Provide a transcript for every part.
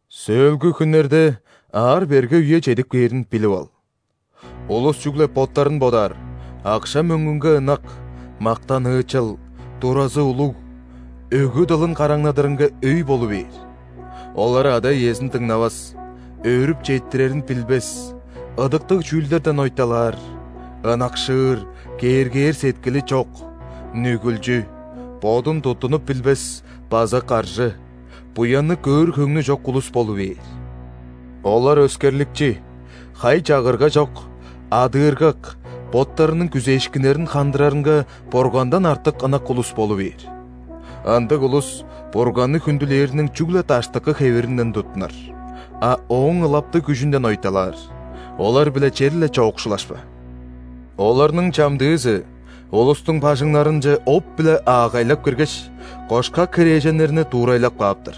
Сөөлгү хүннерде аар-берге үе чедип кээрин билип ал. Улус чүгле боттарын бодаар, акша-мөңгүнге ынак, мактаныычал, туразы улуг, өгү-дылын караңнадырынга өй болу бээр. Олар ада-иезин дыңнавас, өөрүп четтирерин билбес, ыдыктыг чүүлдерден ойталаар, ынакшыыр, кээргээр сеткили чок, нүгүлчү, бодун туттунуп билбес база каржы, буянны көөр хөңнү чок улус болу бээр. Олар өскерликчи, хай-чагырга чок, адыыргак, боттарының күзээшкиннерин хандырарынга Бургандан артык ынак улус болу бээр. Ындыг улус Бурганны хүндүлээриниң чүгле даштыкы хевиринден туттунар, а Ооң ылаптыг күжүнден ойталаар. Олар-биле черле чоокшулашпа. Оларның чамдыызы улустуң бажыңнарынче оп-биле аагайлап киргеш, кошкак херээженнерни дуурайлап кааптар.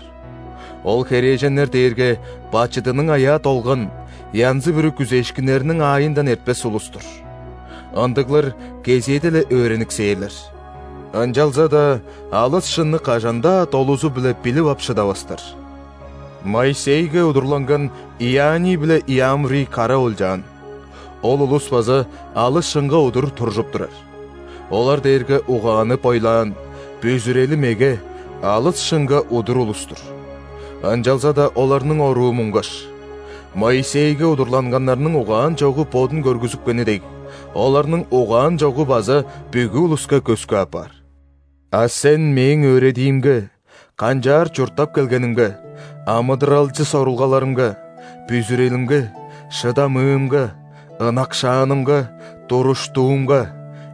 Ол херээженнер дээрге бачыдының аяа долган, янзы-бүрү күзээшкиннериниң аайындан эртпес улус-тур. Ындыглар кезээде-ле өөрениксээрлер, ынчалза-даа алыс шынны кажан-даа долузу-биле билип ап шыдавастар. Моисейге удурланган Ианний биле Иамврий кара олчаан, ол улус база алыс шынга удур туржуп турар. Олар дээрге угааны бойлаан, бүзүрели меге, алыс шынга удур улус-тур. Ынчалза-даа оларның оруу муңгаш: Моисейге удурланганнарның угаан чогу бодун көргүзүпкени дег, оларның угаан чогу база бүгү улуска көскү апаар. А сен мээң өөредиимге, канчаар чурттап келгенимге, амыдыралчы сорулгаларымга, бүзүрелимге, шыдамыымга, ынакшаанымга, туруштуумга,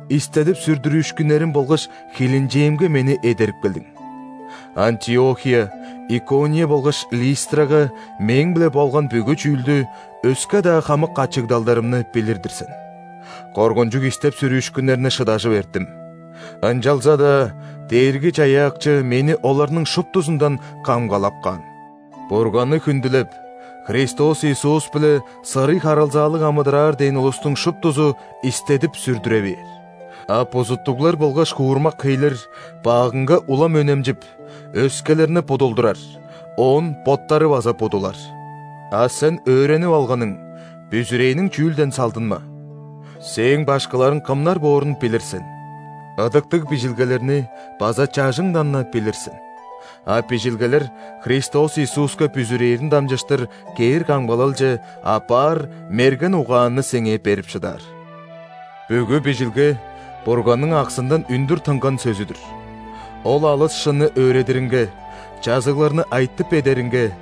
истедип-сүрдүрүүшкүннерим болгаш хилинчээмге мени эдерип келдиң. Антиохия, Икония болгаш Листрага мээң-биле болган бүгү чүүлдү, өске-даа хамык качыгдалдарымны билир-дир сен. Коргунчуг истеп-сүрүүшкүннерни шыдажып эрттим. Ынчалза-даа Дээрги-Чаяакчы мени оларның шуптузундан камгалап каан. Бурганны хүндүлеп, Христос Иисус-биле сырый харылзаалыг амыдыраар дээн улустуң шуптузу истедип-сүрдүре бээр. А бузуттуглар болгаш хуурмак хейлер багынга улам өнемчип, өскелерни будулдурар, оон боттары база будулар. А сен өөренип алганың, бүзүрээниң чүүлден салдынма. Сээң башкыларың кымнар боорун билир сен, Ыдыктыг Бижилгелерни база чажыңдан-на билир сен. А Бижилгелер Христос Иисуска бүзүрээрин дамчыштыр кээр камгалалче аппаар мерген угаанны сеңээ берип шыдаар. Бүгү Бижилге Бурганның аксындан үндүр тынган сөзү-дүр, ол алыс шынны өөредиринге, чазыгларны айтып, эдеринге,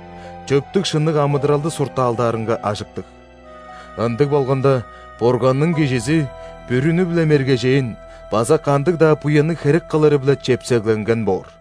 чөптүг-шынныг амыдыралды суртаалдаарынга ажыктыг. Ындыг болганда, Бурганның кижизи бүрүнү-биле мергежээн база кандыг-даа буянныг херек кылыры-биле чепсегленген боор.